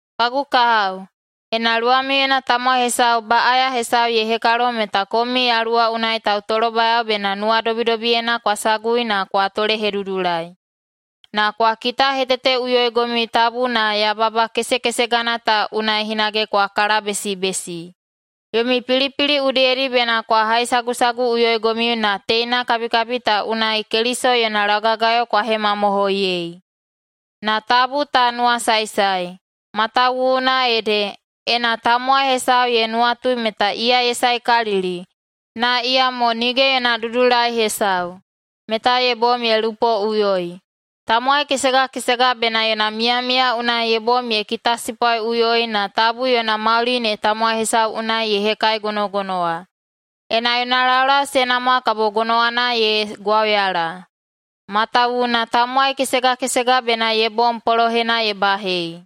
Kagu kahao, ena luwamiuyena tamowai hesau baꞌaya hesau ye hekalo meta komiu Yaluwa unai tautolobayao bena nuwadobidobiyena kwa sagui na kwa tolehedudulai. Na kwa kitaheteteꞌuyoigomiu tabu na yababa kesekesegana ta unai hinage kwa kalabesibesi. Yomi pilipili udiyedi bena kwa haisagusaguꞌuyoigomiu na teina kabikabi ta unai Keliso yona laugagayo kwa hemamohoiyei. [Na tabu ta nuwasaesae,] matawuwuna ede, ena tamowai hesau ye nuwatui meta iya ye saekalili, na iyamo nige yona dudulai hesau, meta ye bom ye lupoꞌuyoi. Tamowai kesega kesega bena yona miyamiya unai ye bom ye kitasipwaiꞌuyoi na tabu yona mauli ne tamowai hesau unai ye hekaigonogonowa. Ena yona laulau se namwa kabo gonowana ye gwauyala. Matawuwuna tamowai kesega kesega bena ye bom polohena ye bahei.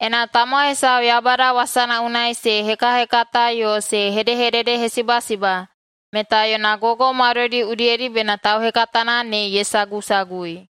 Ena tamowai hesau Yaubada wasana unai se hekahekata yo se hedehededehesibasiba meta yona gogo maudoidi udiyedi bena tauhekatana ne ye sagusagui.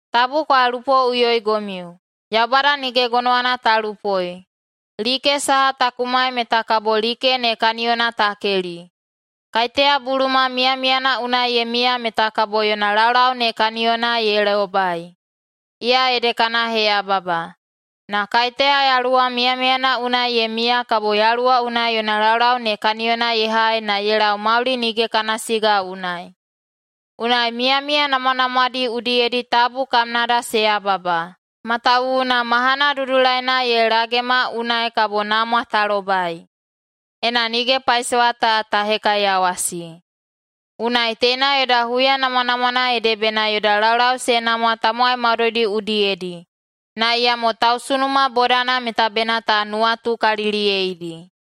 Tabu kwa lupoꞌuyoigomiu. Yaubada nige gonowana ta lupoi. Like saha ta kumai meta kabo like ne kaniyona ta keli. Kaiteya buluma miyamiyana unai ye miya meta kabo yona laulau ne kaniyona ye lobai, iya ede kana heyababa. Na kaiteya yaluwa miyamiyana unai ye miya kabo Yaluwa unai yona laulau ne kaniyona ye hai na ye lau mauli nige kana siga unai. Unai miyamiya namwanamwadi udiyedi tabu kamnada se yababa, matawuwuna mahana dudulaina ye lagema unai kabo namwa ta lobai, ena nige paisowa ta ta hekaiyawasi. Unai teina yoda huya namwanamwana ede bena yoda laulau se namwa tamowai maudoidi udiyedi, na iyamo tausunuma bodana meta bena ta nuwatukaliliyeidi.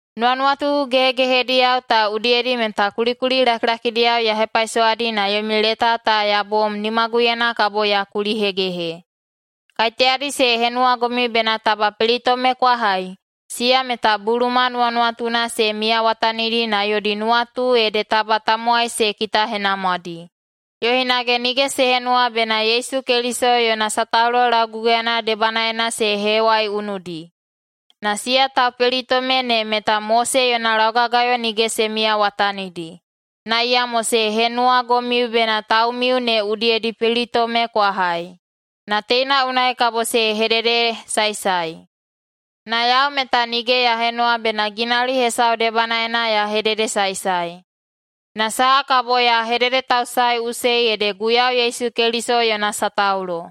Nuwanuwatu gehegehediyao ta udiyedi meta kulikuli lakilakidiyao ya hepaisowadi na yomi leta ta ya bom nimaguyena kabo ya kulihegehe. Kaiteyadi se henuwagomiu bena taba pelitome kwa hai, siya meta buluma nuwanuwatuna se miyawatanidi na yodi nuwatu ede taba tamowai se kitahenamwadi, yo hinage nige se henuwa bena Yesu Keliso yona sataulo lauguguyana debanaena se hewaiunudi. Na siya taupelitome ne meta Mose yona laugagayo nige se miyawatanidi, na iyamo se henuwagomiu bena taumiu ne udiyedi pelitome kwa hai. Na teina unai kabo se hededesaesae. Na yau meta nige ya henuwa bena ginauli hesau debanaena ya hededesaesae, na saha kabo ya hededetausaeꞌusei ede Guiyau Yesu Keliso yona sataulo.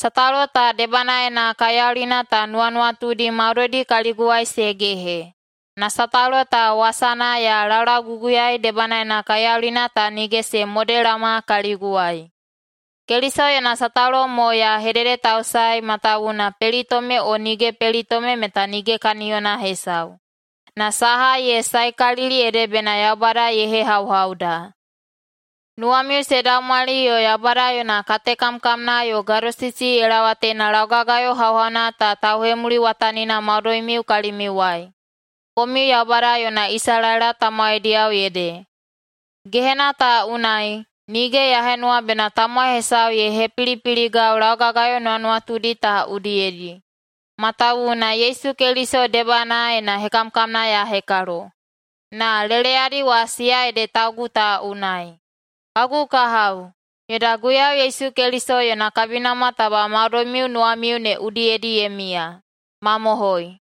Sataulo ta debanaena kaiyaulina ta nuwanuwatudi maudoidi kaliguwai se gehe, na sataulo ta wasana ya laulauguguyaei debanaena kaiyaulina ta nige se modelaoma kaliguwai. Keliso yona sataulo mo ya hededetausaei matawuwuna pelitome o nige pelitome meta nige kaniyona hesau, na saha ye saekalili ede bena Yaubada ye hehauhauda. Nuwamiu se daumwali yo Yaubada yona katekamkamna yo gadosisi ye laowa teina laugagayo hauhauna ta tauhemuliwatanina maudoimiu kalimiuwai – komiu Yaubada yona Isalaela tamowaidiyao ede. Gehena ta unai, nige ya henuwa bena tamowai hesau ye hepilipiligau laugagayo nuwanuwatudi ta udiyedi, matawuwuna Yesu Keliso debanaena hekamkamna ya hekalo, na leleyadi wa siya ede taugu ta unai. Kagu kahao, yoda Guiyau Yesu Keliso yona kabinamwa taba maudoimiu nuwamiu ne udiyedi ye miya. Mamohoi!